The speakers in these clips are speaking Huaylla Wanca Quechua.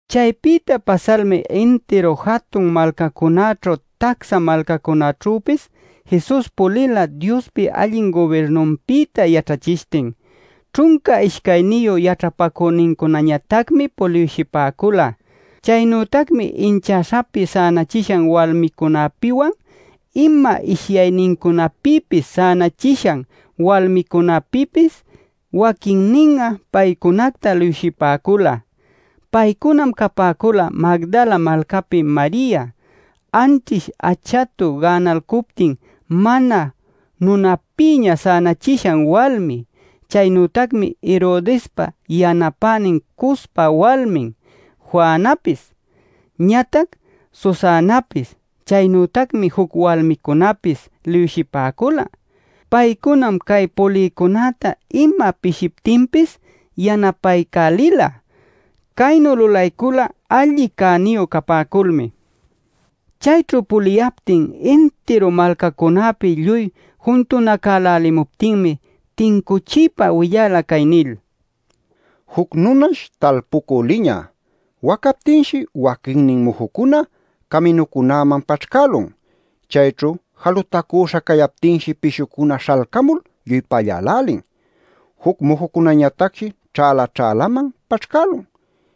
Caypïta pasalmi intiru jatun malcacunäćhu tacsa malcacunaćhüpis Jesus pulila Diospa allin gubirnunpïta yaćhachishtin. Ćhunca ishcayniyu yaćhapacünincunañatacmi puliwshipäcula. Chaynütacmi inchäśhapi sänachishan walmicunapïwan, ima ishyaynincunapïpis sänachishan walmicunapïpis, waquinnin'a paycunacta liwshipäcula. Paycunam capäcula Magdala malcapi Maria, anćhish achatu gänalcuptin mana nunapïña sänachishan walmi. Chaynütacmi Herodespa yanapänin Cuzpa walmin Juanapis, ñatac Susanapis. Chaynütacmi juc walmicunapis liwshipäcula. Paycunam cay pulïcunäta ima pishiptinpis yanapaycälila. Caynu lulaycula alli cäniyu capäculmi. Chayćhu puliyaptin intiru malcacunäpi lluy juntunacälälimuptinmi tincuchiypa willala cay nil: “Juc nunash talpucü liñä. Wacaptinshi waquinnin mujucuna caminucunäman paćhcälun. Chayćhu jalutacüśha cayaptinshi pishucuna śhalcamul lluy pallälälin. Juc mujucunañatacshi ćhäla-ćhälaman paćhcälun.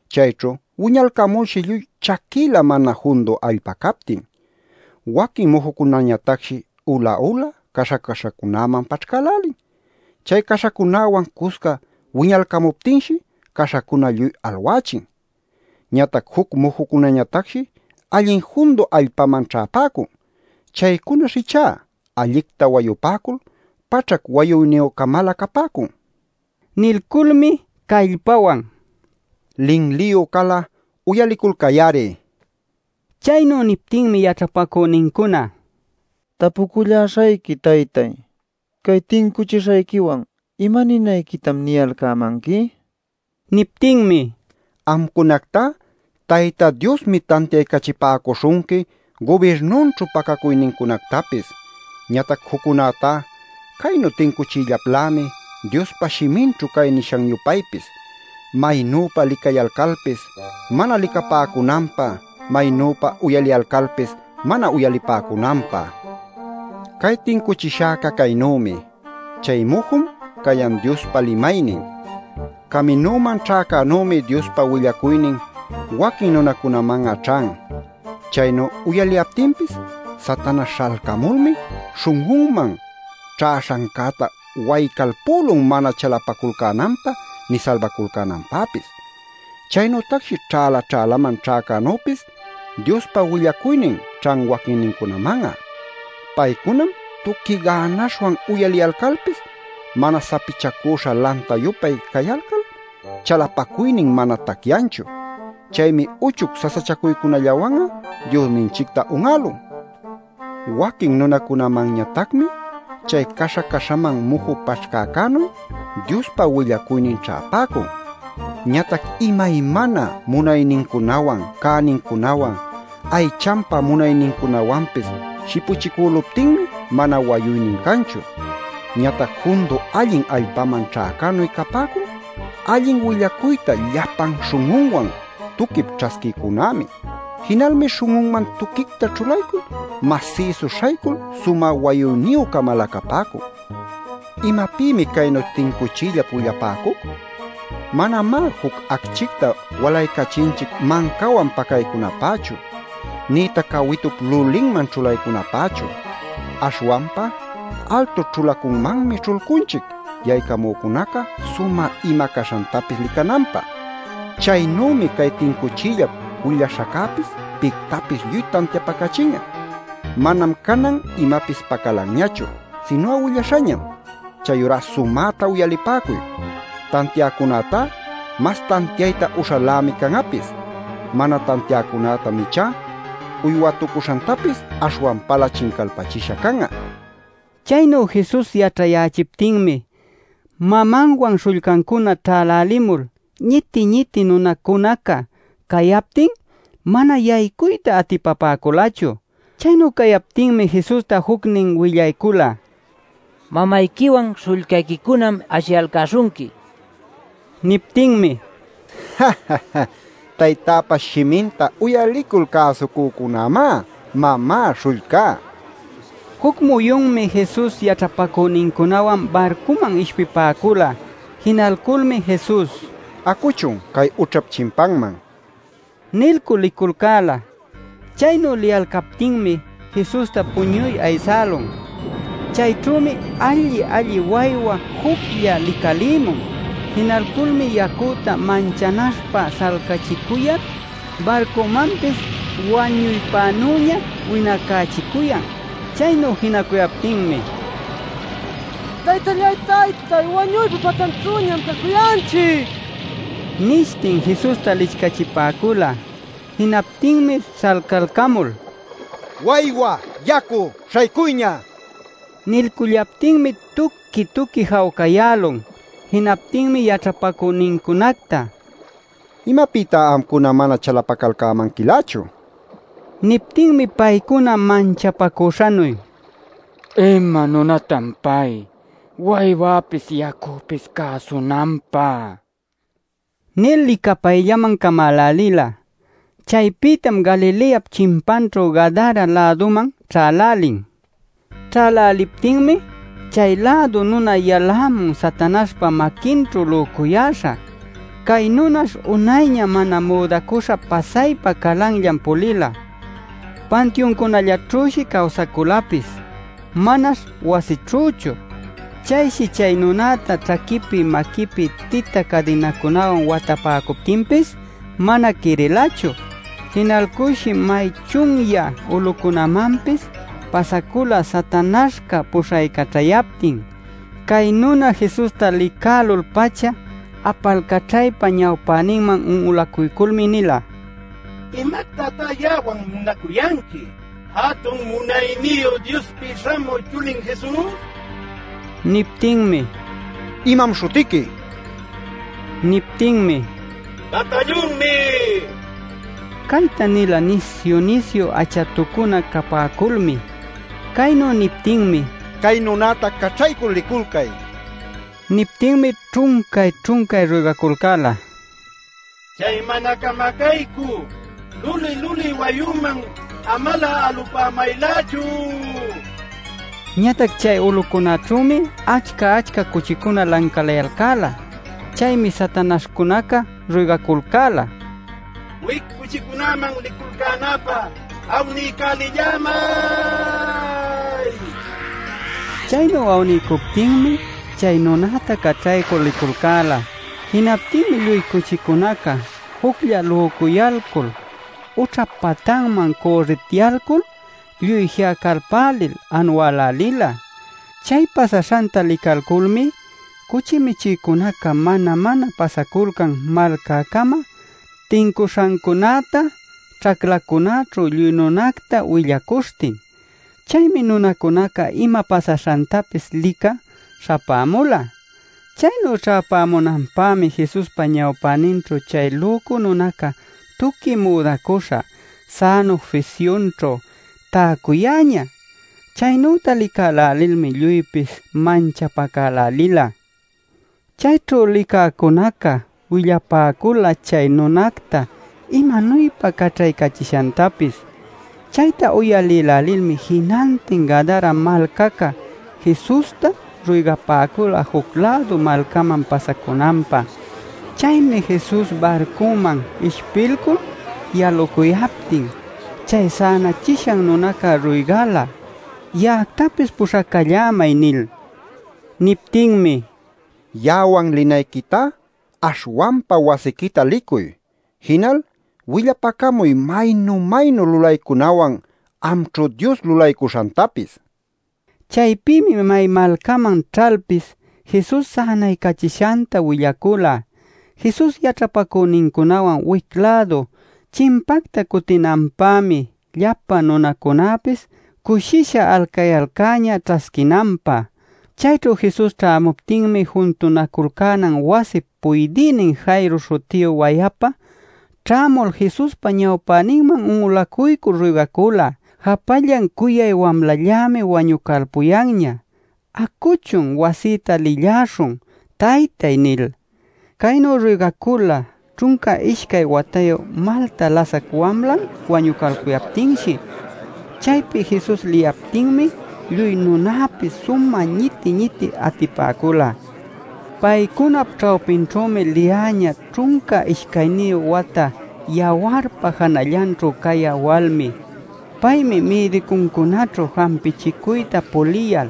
Chayćhu wiñalcamulshi lluy chaquïla mana jundu allpa captin. Waquin mujucunañatacshi ula-ula, caśha caśhacunäman paćhcälälin. Chay caśhacunäwan cusca wiñalcamuptinshi caśhacuna lluy alwächin. Ñatac juc mujucunañatacshi allin jundu allpaman ćhäpäcun. Chaycunash ichá allicta wayupäcul paćhac wayuyniyü-camalä capäcun” nil. Nilculmi callpawan: “¡Linliyu cal'a uyaliculcay-ari!” nila. Chaynu niptinmi yaćhapacünincuna: “Tapuculläśhayqui, taytáy. Cay tincuchishayquiwan ¿imaninayquitam niyalcämanqui?” nin. Niptinmi: “Amcunactá Tayta Diosmi tantiaycachipäcuśhunqui gubirnunćhu pacacuynincunactapis. Ñatac juccunätá caynu tincuchiyllaplämi, Diospa shiminćhu cay nishan-yupaypis: ‘Maynüpa licayalcalpis mana licapäcunanpä; maynüpa uyaliyalcalpis mana uyalipäcunanpä’ nil. “Cay tincuchishäca caynümi: Chay mujum cayan Diospa limaynin. Caminuman ćhäcänümi Diospa willacuynin waquin nunacunaman'a ćhan. Chaynu uyaliyaptinpis Satanaśh śhalcamulmi śhun'unman ćhäśhancäta waycalpülun mana chalapaculcänanpä nï salbaculcänanpäpis. “Chaynütacshi ćhäla-ćhälaman ćhäcänüpis Diospa willacuynin ćhan waquinnincunaman'a. Paycunam tuqui gänaśhwan uyaliyalcalpis mana sapichacüśha lanta-yupay cayalcal chalapacuynin mana tacyanchu. Chaymi uchuc sasachacuycunallawan'a Diosninchicta un'älun. “Waquin nunacunamanñatacmi chay caśha-caśhaman muju paćhcäcänuy Diospa willacuynin ćhäpäcun. Ñatac imaymana munaynincunawan cänincunawan aychanpa munaynincunawanpis shipuchicüluptinmi mana wayuynin canchu. “Ñatac jundu allin allpaman ćhäcänuy capäcun allin willacuyta llapan śhun'unwan tuquip ćhasquïcunämi. Jinalmi śhun'unman tuquicta ćhulaycul, masïsu śhaycul sumä wayuyniyü-camalä capäcun. “[¿Imapïmi caynu tincuchiyllap willapäcuc?] Manamá juc acchicta walaycachinchic mancawan pacaycunapächu, nïtac cawitup lulinman ćhulaycunapächu. Aśhwanpa altu ćhulacunmanmi ćhulcunchic yaycamücunaca sumä ima caśhantapis licananpä. Chaynümi cay tincuchiyllap willaśhaccäpis pictapis lluy tantiapacachin'a. Manam canan imapis pacalanñachu, sinu'a willaśhañam. Chayurá sumäta uyalipäcuy. Tantiäcunätá mas tantiayta uśhalämi can'apis. Mana tantiäcunätam ichá uywätucuśhantapis aśhwanpalä chincalpächisha can'a” nila. Chaynu Jesus yaćhayächiptinmi mamanwan śhullcancuna ćhälälimul ñiti-ñiti nunacunaca cayaptin mana yaycuyta atipapäculachu. Chaynu cayaptinmi Jesusta jucnin willaycula: “Mamayquiwan śhullcayquicunam ashiyalcäśhunqui” nil. Niptinmi: “Taytäpa shiminta uyalicul cäsucücunämá mamá, śhullcá” nila. Juc muyunmi Jesus yaćhapacünincunawan barcuman ishpipäcula. Jinalculmi Jesus: “Acuchun cay ućhap chimpanman” nilcul liculcäla. Chaynu liyalcaptinmi Jesusta puñuy aysälun. Chayćhümi alli-alli waywa juclla licalïmun. Jinalculmi yacüta manchanaśhpä śhalcachicuyal barcumanpis wañuypänüña winacächicuyan. Chaynu jinacuyaptinmi: “¡Taytallay taytay, wañuypa patanćhüñam cacuyanchic!” nishtin Jesusta licchachipäcula. Jinaptinmi śhalcalcamul: “¡Waywa, yacu, śhaycuyña!” nila. Nilcullaptinmi tuqui-tuqui jawcayälun. Jinaptinmi yaćhapacünincunacta: “¿Imapïtá amcuna mana chalapacalcämanquilächu?” nila. Niptinmi paycuna manchapacüśhanuy: “¿Ima nunatan pay, waywäpis yacüpis cäsunanpä?” nil licapayllaman camälälila. Chaypïtam Galileap chimpanćhu Gadara-läduman ćhälälin. Ćhäläliptinmi chay-lädu nuna yalämun Satanaśhpa maquinćhu lücuyäśha. Cay nunash unayña mana müdacüśha pasaypa calanllan pulila. Pantiuncunallaćhüshi cawsaculapis, manash wasićhüchu. Chayshi chay nunäta ćhaquipi maquipi tita cadinacunawan watapäcuptinpis mana quirilachu. Jinalculshi may chunyä ulucunämanpis pasacula Satanaśhca puśhaycaćhayaptin. Cay nuna Jesusta licälul-pacha apalcaćhaypa ñawpäninman un'ulacuyculmi nila: “¡¿Imactatá ya'awan munacuyanqui, Jatun Munayniyu Diospi Śhamü Chulin Jesus?!” nil. Niptinmi: “¿Imam śhutiqui?” nila. Niptinmi: “Batallunmi” nila. Cayta nila nisyu-nisyu achatucuna capäculmi. Caynu niptinmi: “¡Cay nunäta caćhaycul liculcay!” nin. Niptinmi ćhuncay-ćhuncay ruygaculcäla: “¡Chay mana camacaycü luli-luli wayüman amalä alupämaylächu!” nil. Ñatac chay ulucunaćhümi achca-achca cuchicuna lancalayalcäla. Chaymi satanaśhcunaca ruygaculcäla: “¡Wic cuchicunäman liculcänapä awniycälillämay!” nil. Chaynu awniycuptinmi chay nunäta caćhaycul liculcäla. Jinaptinmi lluy cuchicunaca juclla lücuyalcul ućhap patanman cürritityalcul lluy ji'acalpälil anuälälila. Chay pasaśhanta licalculmi cuchi michïcunaca mana-mana pasaculcan malcäcama tincuśhancunäta ćhaclacunäćhu lluy nunacta willacuśhtin. Chaymi nunacunaca ima pasaśhantapis licä śhapämula. Chaynu ćhäpämunanpämi Jesuspa ñawpäninćhu chay lücu nunaca tuqui müdacuśha, sänu fisyunćhu täcuyäñä. Chaynüta licälälilmi lluypis manchapacälälila. Chayćhu licäcunaca willapäcula chay nunacta imanuypa caćhaycachishantapis. Chayta uyalïlälilmi jinantin Gadara malcaca Jesusta ruygapäcula juc-lädu malcaman pasacunanpä. Chaymi Jesus barcunman ishpilcul yalucuyaptin chay sänachishan nunaca ruygala: “Ya'actapis puśhacallämay” nil. Niptinmi: “Ya'awan linayquitá aśhwanpa wasiquita licuy. Jinal willapacamuy maynu-maynu lulaycunawan amćhu Dios lulaycuśhantapis” nila. Chaypïmi may malcaman ćhalpis Jesus sänaycachishanta willacula. Jesus yaćhapacünincunawan wic-lädu chimpacta cutinanpämi llapa nunacunapis cushisha alcayalcäñä ćhasquinanpä. Chayćhu Jesus ćhämuptinmi juntunaculcänan wasip puydïnin Jairo śhutiyu wayapa ćhämul Jesuspa ñawpäninman un'ulacuycul ruygacula: “Japallan cuyay wamlallämi wañucalpuyanña. Acuchun, wasïta lïlläśhun, taytay” nil. Caynu ruygacula ćhunca ishcay watayu malta lasac wamlan wañucalpuyaptinshi. Chaypi Jesus liyaptinmi lluy nunapis sumä ñiti-ñiti atipäcula. Paycunap ćhawpinćhümi liyäñä ćhunca ishcayniyu wata yawarpa janallanćhu cayä walmi. Paymi mïdicuncunäćhu jampichicuyta puliyal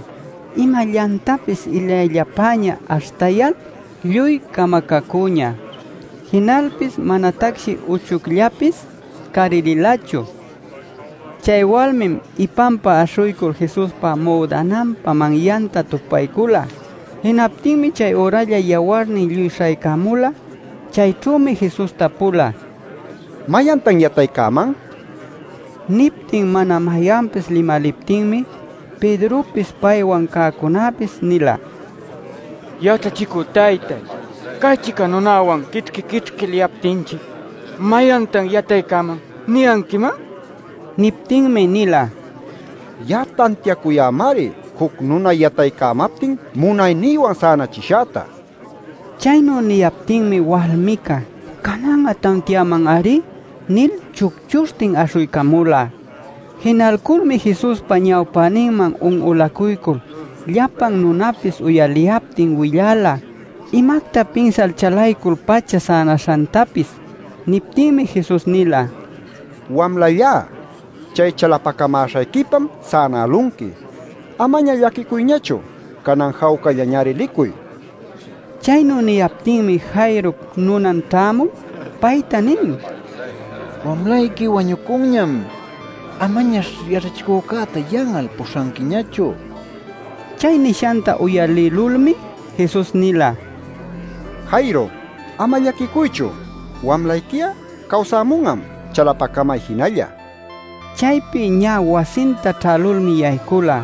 imallantapis illayllapäña aśhtayal lluy camacacüñä. Jinalpis manatacshi uchucllapis carililachu. Chay walmim ipanpa aśhuycul Jesuspa müdananpa manyanta tupaycula. Jinaptinmi chayüralla yawarnin lluy śhaycämula. Chayćhümi Jesus tapula: “¿Mayantan yataycäman?” nil. Niptin mana mayanpis limaliptinmi Pedropis paywan cäcunapis nila: “Yaćhachicü taytáy, cay-chica nunawan'a quićhqui-quićhqui liyaptinchic ‘¿Mayantan yataycäman?’ niyanquiman” nil. Niptinmi nila: “Ya'a tantiacuyämari juc nuna yataycamaptin munaynïwan sänachishäta” nil. Chaynu niyaptinmi walmica “Canan'a tantiaman-ari” nil chucchuśhtin aśhuycamula. Jinalculmi Jesuspa ñawpäninman un'ulacuycul llapan nunapis uyaliyaptin willala imacta pinsal chalaycul-pacha sänaśhantapis. Niptinmi Jesus nila: “Wamlallá, chay chalapacamäśhayquipam sänälunqui. Amaña llaquicuyñachu. Canan jawcallañari licuy” nil. Chaynu niyaptinmi Jairop nunan ćhämul payta nin: “Wamlayqui wañucunñam. Amañash yaćhachicücäta yan'al puśhanquiñachu” nil. Chay nishanta uyalïlulmi Jesus nila: “Jairo, ama llaquicuychu. Wamlayqui'a cawsämun'am. Chalapacamay jinalla” nil. Chaypi ñä wasinta ćhälulmi yaycula,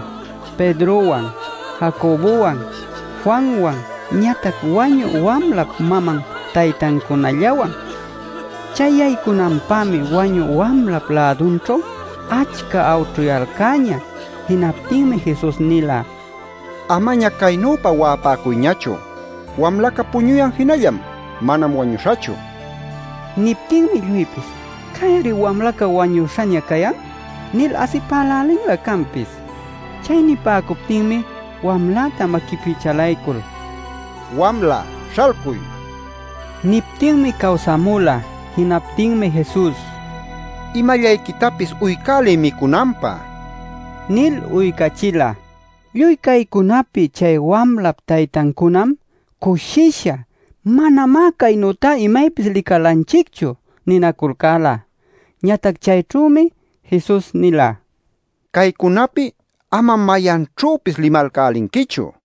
Pedrowan, Jacobowan, Juanwan ñatac wañü wamlap maman taytancunallawan. Chay yaycunanpämi wañü wamlap lädunćhu achca awćhuyalcäñä. Jinaptinmi Jesus nila: “Amaña caynüpa wa'apäcuyñachu. Wamlaca puñuyan jinallam; manam wañuśhachu” nil. Niptinmi lluypis: “Cay-ari wamlaca wañüśhaña cayan” nil asipälälinlä canpis. Chay nipäcuptinmi wamläta maquipi chalaycul: “¡Wamla, śhalcuy!” nila. Niptinmi cawsämula. Jinaptinmi Jesus: “Imallayquitapis uycäliy micunanpä” nil uycachila. Lluy caycunapi chay wamlap taytancunam cushisha: “¡Manamá caynüta imaypis licalanchicchu!” ninaculcäla. Ñatac chayćhümi Jesus nila: “Caycunapi amam mayanćhüpis limalcälinquichu” nil.